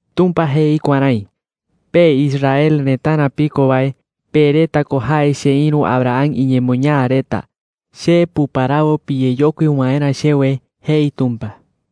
8Tumpa jei kuärái: “Pe Israel retarä piko wae, pe reta ko jae cheïru Abraham iñemoñaa reta. Che puparawo piyeyokui waerä chewe,” jei Tumpa.